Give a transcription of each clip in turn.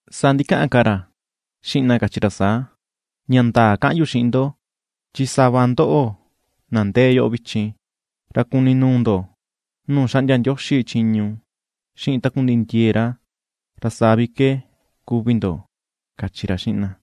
Saa ndikaꞌan ka ra xiꞌin na kachi ra saa: ―Ña ndaa kaꞌan yu xiꞌin ndo, chi sava ndoꞌo na ndee yoꞌo vichin, ra kuni nuu ndo nuu xaꞌndia Ndioxi chiñu xiꞌin takundiꞌi ndie̱e̱ ra, ra saa vi ke kuvi ndo ―kachi ra xiꞌin na.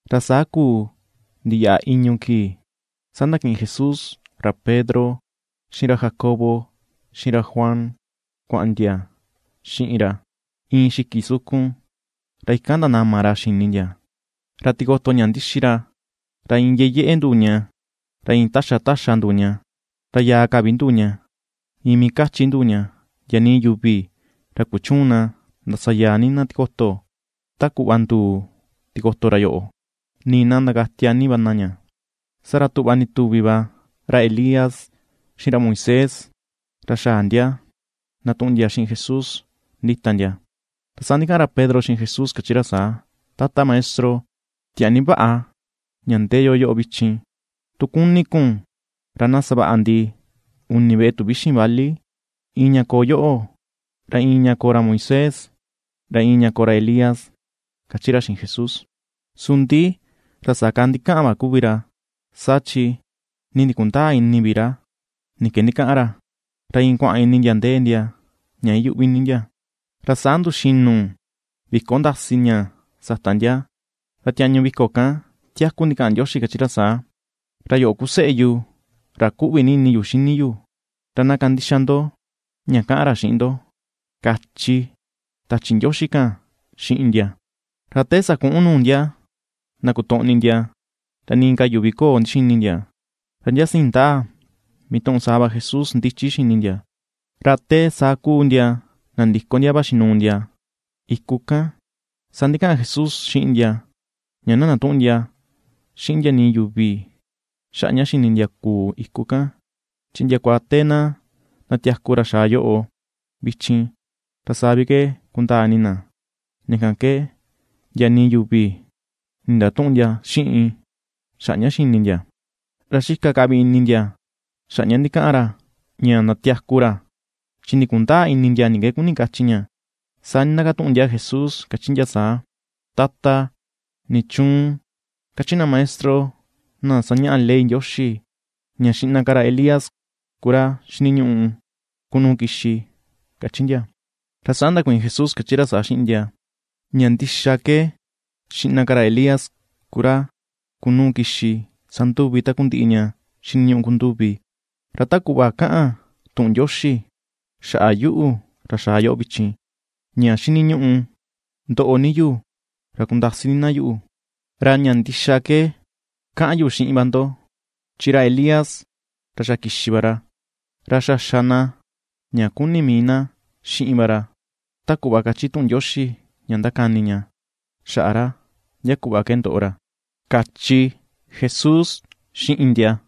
Ra saa kuu ndiyaꞌa i̱ñu̱ kii, saa ndakiꞌin Jesús ra Pedro xiꞌin ra Jacobo, xiꞌin ra Juan kuaꞌan ndia xiꞌin ra iin xiki sukun. Ra ikan ndanama ra xini ndia. Ra tikoto ña ndixi ra, ra iin yeyeꞌe nduu ña, ra iin taxa taxa nduu ña, ra yàà ka vi nduu ña, iin mii kachi̱ nduu ña; ndia nii yuvi ra kuchüun na ndasayaa ni na tikoto ta kuꞌva nduu tikoto ra yoꞌo, nii na ndakatia ni va na ña. Saa ra tuꞌva ndituvi va ra Elías xiꞌin ra Moisés, ra xaꞌa ndia ndatuꞌun ndia xiꞌin Jesús ndita ndia. Ra saa ndikaꞌan ra Pedro xiꞌin Jesús, kachi ra saa: ―Tata Maestro, tiaa ni vaꞌa ña ndee yo yoꞌo vichin, tu kuni kun ra na savaꞌa ndi uni veꞌe tuvíxi̱n vali, iin ña koo yoꞌo, ra iin ña koo ra Moisés, ra iin ña koo ra Elías ―kachi ra xiꞌin Jesús. Su ndi ra saa ka ndikaꞌan va kuvi ra, saa chi nii ndikundäa ini vi ra ni ke ndikaꞌan ra, ra iin kuaꞌan ini ndia ndee ndia ña iyuꞌvi ni ndia. Ra saa nduxinu vi̱ko̱ ndasi ña sata ndia. Ra tiañu vi̱ko̱ kan tiaku ndikaꞌan Ndioxi, kachi ra saa: ―Ra yoꞌo ku Seꞌe yu ra ^kuꞌvi ni ini yu xini yu, ra na kandixa ndo ña kaꞌan ra xiꞌin ndo, ―kachi tachi Ndioxi kan xiꞌin ndia. Ra te sakuꞌun nuu ndia ndakotoꞌni ndia, ra nii ka yuvi köo ndixini ndia, ra ndia siin ndaa mituꞌun saa va Jesús ndichi xini ndia. Ra te saa kuu ndia nandiko ndia vaxi nuu ndia iku kan, saa ndikaꞌan Jesús xiꞌin ndia ña na ndatüꞌun ndia xiꞌin ndia nii yuvi xaꞌa ña xini ndia kuu iku kan, chi ndiakua te na ndatiaku ra xaa yoꞌo vichin, ra saa vi ke kundaa ini na. Ña kan ke ndia nii yuvi nindatüꞌun ndia xiꞌin xaꞌa ña xini ndia. Ra xika ka vi ini ndia xaꞌa ña ndikaꞌan ra ña ndatiaku ra, chi ndikundäa ini ndia ni ke kuni kachi ña. Saa ndindakatuꞌun ndia Jesús kachi ndia saa: ―Tata, ¿nichuun kachi na maestro na sañaꞌa ley Ndioxi ña xiꞌna ka ra Elías ku ra xiniñuꞌu kunuu kixi? ―kachi ndia. Ra saa ndakuiin Jesús kachi ra saa xiꞌin ndia: ―Ña ndixa ke, xiꞌna ka ra Elías ku ra kunuu kixi sanduvi takundiꞌi ña xiniñuꞌu kunduvi. Ra ta kuꞌva kaꞌan tuꞌun Ndioxi xaꞌa yuꞌu, ra xaa yoꞌo vichin, ña xiniñuꞌu ndoꞌo ni yu ra kundasi ni na yuꞌu. Ra ña ndixa ke kaꞌan yu xiꞌin va ndo, chi ra Elías ra xa kixi va ra, ra xa xa na ña kuni̱ mii na xiꞌin va ra, ta kuꞌva kachi tuꞌun Ndioxi ña ndakani ña xaꞌa ra ndia kuꞌva ke ndoꞌo ra ―kachi Jesús xiꞌin ndia.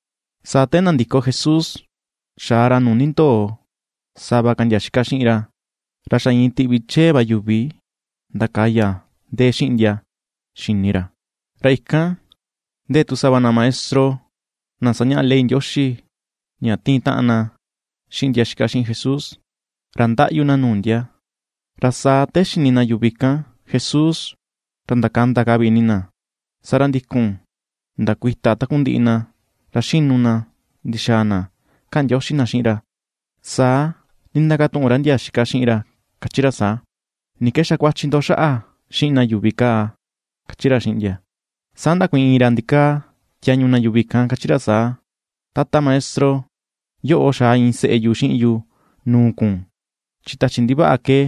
Saa te ndandiko Jesús xaa ra nuu nindoo sava ka ndia xika xiꞌin ra, ra xa iin tiꞌvi chee va yuvi ndakaya ndee xiꞌin ndia xini ra, ra ikan ndee tu sava na maestro na sañaꞌa ley Ndioxi ña tiin taꞌan na xiꞌin ndia xika xiꞌin Jesús, ra ndaꞌyu na nuu ndia. Ra saa te xini na yuvi kan Jesús ra ndakanda ka vi ini na, saa ra ndikun ndakuita takundiꞌi na ra xinu na ndixaa na kaꞌan ndioxi na xiꞌin ra. Saa ndindakatuꞌun ra ndia xika xiꞌin ra kachi ra saa: ―¿Ni ke xakuachi ndo xaꞌa xiꞌin na yuvi kaa ―kachi ra xiꞌin ndia. Saa ndakuiin iin ra ndikaa tiañu na yuvi kan, kachi ra saa: ―Tata Maestro, yoꞌo xaa iin seꞌe yu xiꞌin yu nuu kun, chi tachi ndivaꞌa ke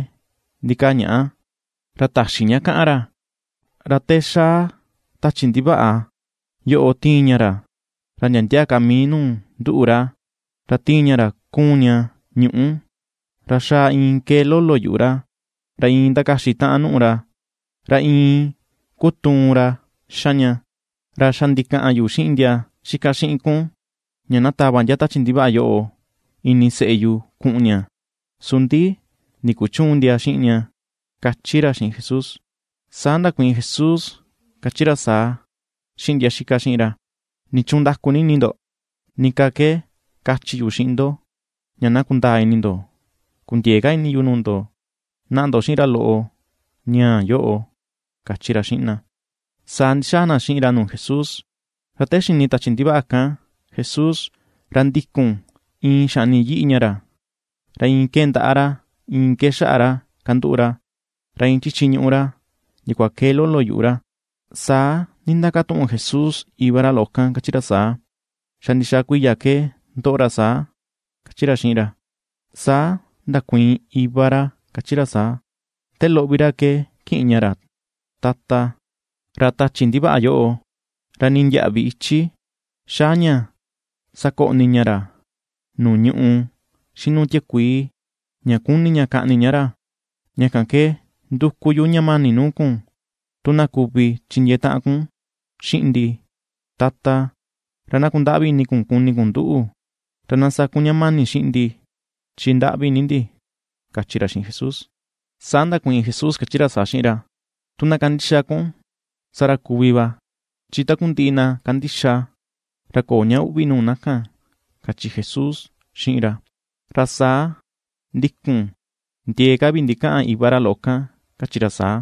ndikaa ñaꞌa, ra täxi ña kaꞌan ra. Ra te ^xaa tachi ndivaꞌa yoꞌo tiin ña ra ndia ndia ka mii nuu ndúꞌu̱ ra, ra tiin ña ra kuun ña ñuꞌú, ra xaꞌa iin kee lolo yuꞌu ra, ra iin ndakaxi taꞌan nùꞌù ra, ra iin kutuun ra xa ña. Ra xa ndikaꞌan yu xiꞌin ndia xika xiꞌin kun ña na tava ndia tachi ndivaꞌa yoꞌo ini seꞌe yu kuꞌun ña, su ndi ndikuchüun ndia xiꞌin ña ―kachi ra xiꞌin Jesús. Saa ndakuiin Jesús kachi ra saa xiꞌin ndia xika xiꞌin ra: ―¿Nichuun ndaku ni ini ndo? ¿Ni ka ke kachi yu xiꞌin ndo, ña na kundaa ini ndo? Kundiëe ka ini yu nuu ndo. Naꞌa ndo xiꞌin ra loꞌo ñaa yoꞌo ―kachi ra xiꞌin na. Saa ndixaa na xiꞌin ra nuu Jesús. Ra te xini tachi ndivaꞌa kan Jesús, ra ndikun iin xaꞌni yiꞌi ña ra, ra iin kee ndaꞌa ra, iin kee xaꞌa ra kanduꞌu ra, ra iin chichi ñuꞌu ra ndiakua kee lolo yuꞌu ra. Saa ndindakatuꞌun Jesús iva ra loꞌo kan, kachi ra saa: ―¿Xa ndixaa kuiya ke ndoꞌo ra saa? ―kachi ra xiꞌin ra. Saa ndakuiin iva ra kachi ra saa: ―Te loꞌo vi ra ke kiꞌin ña ra, Tata. Ra tachi ndivaꞌa yoꞌo, ra nii ndiäꞌvi ichi xaa ña sakoꞌni ña ra nuu ñuꞌù, xiꞌin nuu tiakuii, ña kuni̱ ña kaꞌni ña ra; ña kan ke nduku yu ña mani nuu kun, tu na kuvi chindiee taꞌan kun xiꞌin ndi, Tata, ra na kundaꞌvi ini kun kuni kun nduꞌu, ra na sa kun ña mani xiꞌin ndi, chi ndaꞌvi ni ndi ―kachi ra xiꞌin Jesús. Saa ndakuiin Jesús kachi ra saa xiꞌin ra: ―Tu na kandixa kun saa ra kuvi va, chin takundiꞌi na kandixa ra köo ña uꞌvi nuu na kan ―kachi Jesús xiꞌin ra. Ra saa ndikun ndiee ka vi ndikaꞌan iva ra loꞌo kan, kachi ra saa: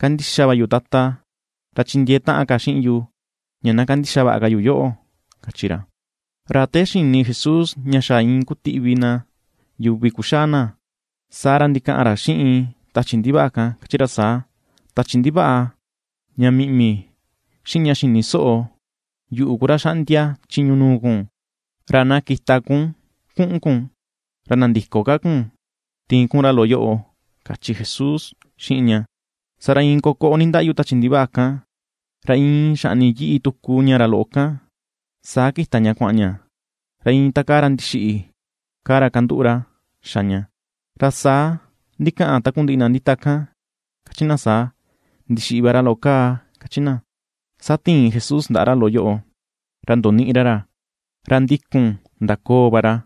―¡Kandixa va yu, Tata, ra chindiee taꞌan ka xiꞌin yu, ña na kandixa vaꞌa ka yu yoꞌo! ―kachi ra. Ra te xini Jesús ña xaꞌa iin kutiꞌvi na yuvi kuxaa na, saa ra ndikaꞌan ra xiꞌin tachi ndivaꞌa kan, kachi ra saa: ―Tachi ndivaꞌa ña miꞌmi, xiꞌin ña xïni soꞌo, yuꞌu ku ra xaꞌndia chiñu nuu kun. Ra na kita kun kuꞌun kun, ra nandïko ka kun tiin kun ra loꞌo yoꞌo ―kachi Jesús xiꞌin ña. Saa ra iin kokoꞌo nindaꞌyu tachi ndivaꞌa kan, ra iin xaꞌni yiꞌi tuku ña ra loꞌo kan, saa kita ña kuaꞌan ña, ra iin ta kaa ra ndixiꞌi kaa ra kanduꞌu ra xa ña, ra saa ndikaꞌan takundiꞌi na ndita kan kachi na saa: “Ndixiꞌi va ra loꞌo kaa” ―kachi na. Saa tiin Jesús ndaꞌa ra loꞌo yoꞌo ra ndoniꞌi ra ra, ra ndikun ndakoo va ra.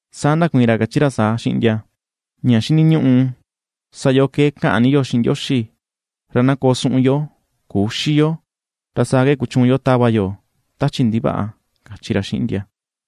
Saa ndakuiin ra, kachi ra saa xiꞌin ndia: ―Ña xiniñuꞌu sa yo ke kaꞌan ni yo xiꞌin Ndioxi, ra na koo suꞌun yo küxi yo, ra saa ke kuchuun yo tava yo tachi ndivaꞌa ―kachi ra xiꞌin ndia.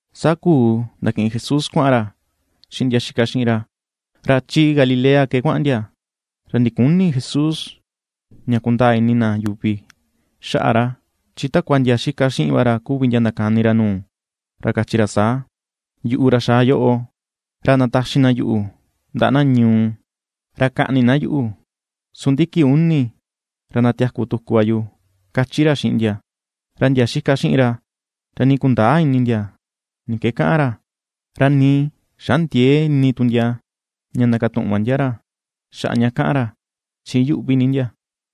Saa kuu ndakiꞌin Jesús kuaꞌan ra xiꞌin ndia xika xiꞌin ra. Ra chi Galilea ke kuaꞌan ndia, ra ndiküni Jesús ña kundaa ini na yuvi xaꞌa ra. Chi takua ndia xika xiꞌin va ra kuvi ndia ndakani ra nuu, ra kachi ra saa: ―Yuꞌu, ra xaa yoꞌo, ra ndataxi na yuꞌu ndaꞌa na ñuu, ra kaꞌni na yuꞌu, su ndi kii uni ra ndatiaku tuku va yu ―kachi ra xiꞌin ndia. Ra ndia xika xiꞌin ra, ra nii kundäa ini ndia ni ke kaꞌan ra, ra nii xandiëe ini tu ndia ña ndakatuꞌun va ndia ra xaꞌa ña kaꞌan ra, chi iyuꞌvi ni ndia.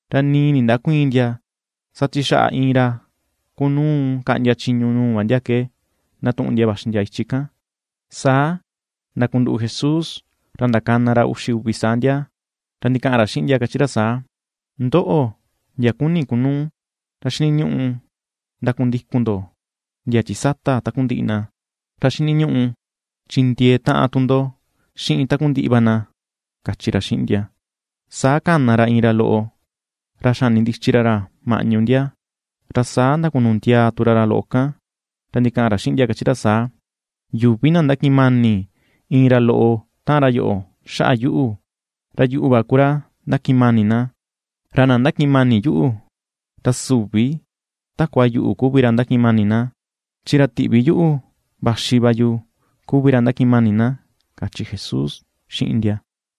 Ra nii ndindäkuiin ndia, saa chi xaꞌa iin ra kunuu kaꞌndia chiñu nuu va ndia ke ndatuꞌun ndia vaxi ndia ichi kan. Saa ndakunduꞌu Jesús, ra ^ndakana ra uxi uvi saa ndia, ra ndikaꞌan ra xiꞌin ndia kachi ra saa: ―Ndoꞌo, ndia kuni̱ kunuu, ra xiniñuꞌu ndakundikun ndo ndia chi sata takundiꞌi na, ra xiniñuꞌu chindiee taꞌan tu ndo xiꞌin takundiꞌi va na ―kachi ra xiꞌin ndia. Saa kana ra iin ra loꞌo ra xanindichi ra ra maꞌñu ndia, ra saa ndakunu ndiaa tu ra ra loꞌo kan, ra ndikaꞌan ra xiꞌin ndia, kachi ra saa: ―Yuvi, na ndakiꞌin mani̱ iin ra loꞌo tan ra yoꞌo xaꞌa yuꞌu, ra yuꞌu va ku ra ndakiꞌin mani̱ na, ra na ndakiꞌin mani̱ yuꞌu, ra süvi takua yuꞌu kuvi ra ndakiꞌin mani̱ na, chi ra tiꞌvi yuꞌu vaxi va yu kuvi ra ndakiꞌin mani̱ na ―kachi Jesús xiꞌin ndia.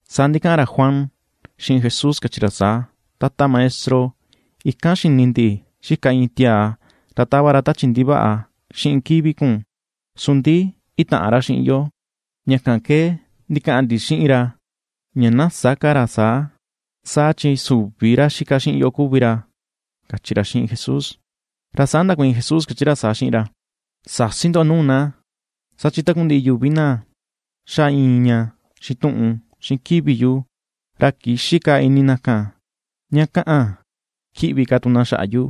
Saa ndikaꞌan ra Juan xiꞌin Jesús kachi ra saa: ―Tata Maestro, ikan xini ndi xika iin tiaa ra tava ra tachi ndivaꞌa xiꞌin kivi kun, su ndi itäꞌan ra xiꞌin yo, ña kan ke ndikaꞌan ndi xiꞌin ra ña na sä ka ra saa, saa chi süvi ra xika xiꞌin yo kuvi ra, ―kachi ra xiꞌin Jesús. Ra saa ndakuiin Jesús kachi saa xiꞌin ra: ―Säsi ndo nuu na, saa chi takundiꞌi yuvi na xa iin ña xituꞌun xiꞌin kivi yu, ra kïxi ka ini na kan ña kaꞌan kiꞌvi ka tu na xaꞌa yu.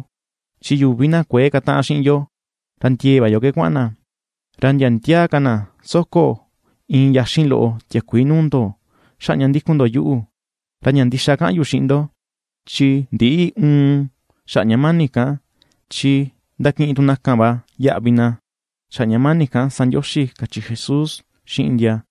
Chi yuvi na kuëe kataꞌan xiꞌin yo, ra ndie̱e̱ va yo ke kuaꞌan na. Ra ndia ndia ka na na taxi iin yaxin loꞌo tiakuii koꞌo̱ ndo xaꞌa ña ^ndíku̱n ndo yuꞌu, ra ña ndixa kaꞌan yu xiꞌin ndo, chi ndïꞌi uun xaꞌa ña mani̱ kan, chi ndakiꞌin tu na kan va yaꞌvi na, xaꞌa ña mani̱ kan sa Ndioxi ―kachi Jesús xiꞌin ndia.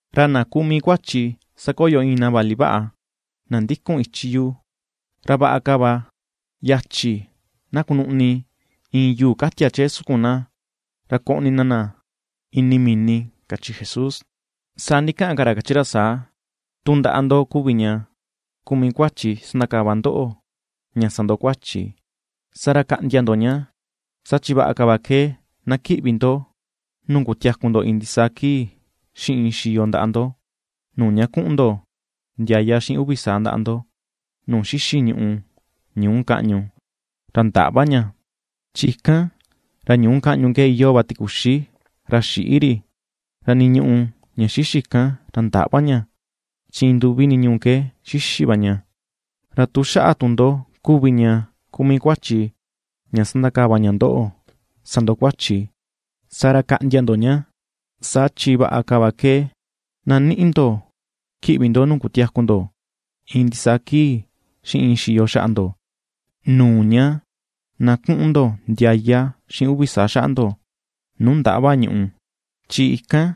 Ra na kuu mii kuachi sakoyo iin na vali vaꞌa, na ndikun ichi yu, ra vaꞌa ka va yachi na kunuꞌni iin yuu katia chee sukun na, ra koꞌni na na ini mini ―kachi Jesús. Saa ndikaꞌan ka ra kachi ra saa: ―Tu ndaꞌa ndo kuvi ña ku mii kuachi sandakava ña ndóꞌo̱ ña sa ndo kuachi, saa ra kaꞌndia ndo ña, saa chi vaꞌa ka va ke na kiꞌvi ndo nuu kutiaku ndo iin ndisaa kii xiꞌin iin xiyo ndaꞌa ndo, nuu ña kuꞌun ndo ndiaya xiꞌin uvi saa ndaꞌa ndo nuu xixi̱ ñùꞌù, ñuu kaꞌñu, ra ndäꞌva ña, chi ikan ra ñuu kaꞌñu ke iyoo va tikuxi ra xïꞌi ri, ra nii ñùꞌù ña xixi̱ kan, ra ndäꞌva ña, chin iin nduvi niñuu ke xixi̱ va ña. Ra tu xaꞌa tu ndo kuvi ña ku mii kuachi ña sandakava ña ndoꞌo sa ndo kuachi, saa ra kaꞌndia ndo ña, saa chi vaꞌa ka va ke na ni̱ꞌi̱ ndo kiꞌvi ndo nuu kutiaku ndo iin ndisaa kii xiꞌin iin xiyo xaꞌa ndo, nuu ña na kuꞌun ndo ndiaya xiꞌin uvi saa xaꞌa ndo, nuu ndäꞌva ñuꞌù, chi ikan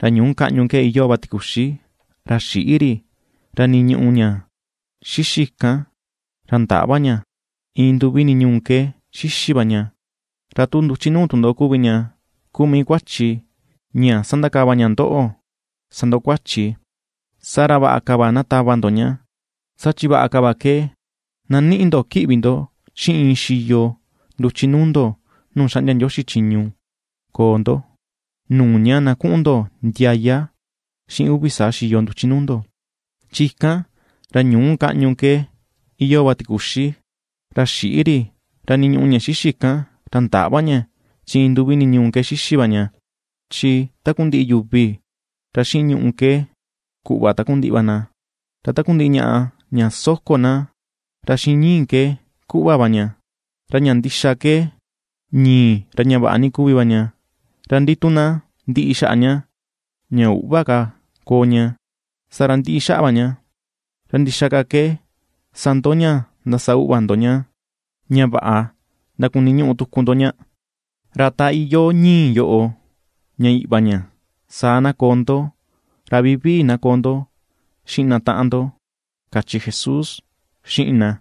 ra ñuu kaꞌñu ke iyoo va tikuxi, ra xïꞌi ri, ra nii ñùꞌù ña xixi̱ kan, ra ndäꞌva ña, iin nduvi niñuu ke xixi̱ va ña. Ra tu nduchi nuu tu ndo kuvi ña ku mii kuachi ña sandakava ña ndoꞌo sa ndo kuachi, saa ra vaꞌa ka va na tava ndo ña, saa chi vaꞌa ka va ke na ni̱ꞌi̱ ndo kiꞌvi ndo xiꞌin iin xiyo nduchi nuu ndo nuu xaꞌndia Ndioxi chiñu koo ndo, nuu ña na kuꞌun ndo ndiaya xiꞌin uvi saa xiyo nduchi nuu ndo, chi ikan, ra ñu̱u kaꞌñu ke iyoo va tikuxi, ra xïꞌi ri, ra nii ñùꞌù ña xixi̱ kan, ra ndäꞌva ña, chi iin nduvi niñuu ke xixi̱ va ña. ’Chi takundiꞌi yuvi ra xiꞌin ñuꞌù ke ku̱ꞌva takundiꞌi va na, ra takundiꞌi ñaꞌa ña soko na ra xiꞌin ñi̱i̱ ke ku̱ꞌva va ña. Ra ña ndixa ke ñi̱i̱ ra ña vaꞌa ni kuvi va ña, ra ndi tu na ndiꞌi xaꞌa ña, ña üꞌva ka koo ña, saa ra, ndiꞌi xaꞌa va ña, ¿Ra ndixaa ka ke sa ndoꞌo ña ndasa uꞌva ndo ña, ra vaꞌa ndakuniñuꞌu tuku ndo ña? Ra ta iyoo ñi̱i̱ yoꞌo ña uꞌva ña, saa na koo ndo, ra vivii na koo ndo xiꞌin na taꞌan ndo ―kachi Jesús xiꞌin na.